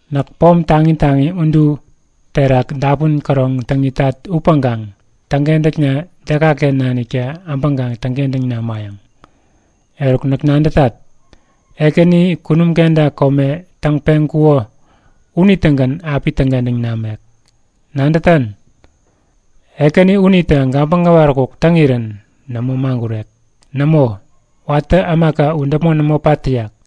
Näk pom taŋi taŋi udu terak dapun käroŋ täŋ itat upäŋkaŋ täŋkentäkna dekaken naniktä äbäŋkaŋ täŋkentäŋ namayäŋ? Eruk näk nadätat, Ekäni kunum kenta kome täŋ-peŋkuko unitägän api täŋkentäŋ namek. Nadätan? Ekäni unitä gabäŋ äwaräkuk täŋirän nämo maŋgurek. Nämo, watä ämaka u däpmon nämo pat täyak.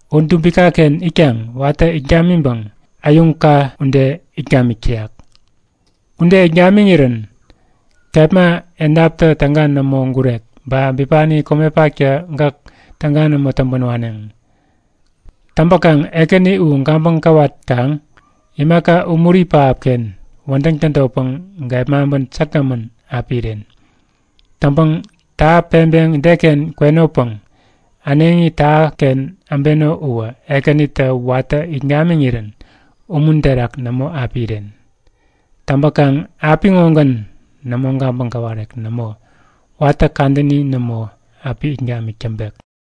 U dubikaken itkaŋ watä it gamiŋpäŋ äyuŋka ude it gamik täyak. Ude it gamiŋirän kepma edaptä täga nämo gurek ba bipani komepaktä gäk täga nämo täŋpän waneŋ. Täŋpäkaŋ Ekäni u gabäŋ gäwatkaŋ imaka umuri pähapken wädäŋ tädotpäŋ gepmaŋpän säkgämän api iren. Täŋpäŋ täha peŋpeŋ deken kwenopäŋ äneŋi tähaken äbeno uwä Ekänitä watä it gamiŋirän umun terak nämo api iren. Täŋpäkaŋ apiŋogän nämo gabäŋ gäwarek. Nämo, watä kadäni nämo, api it gamik täŋpek.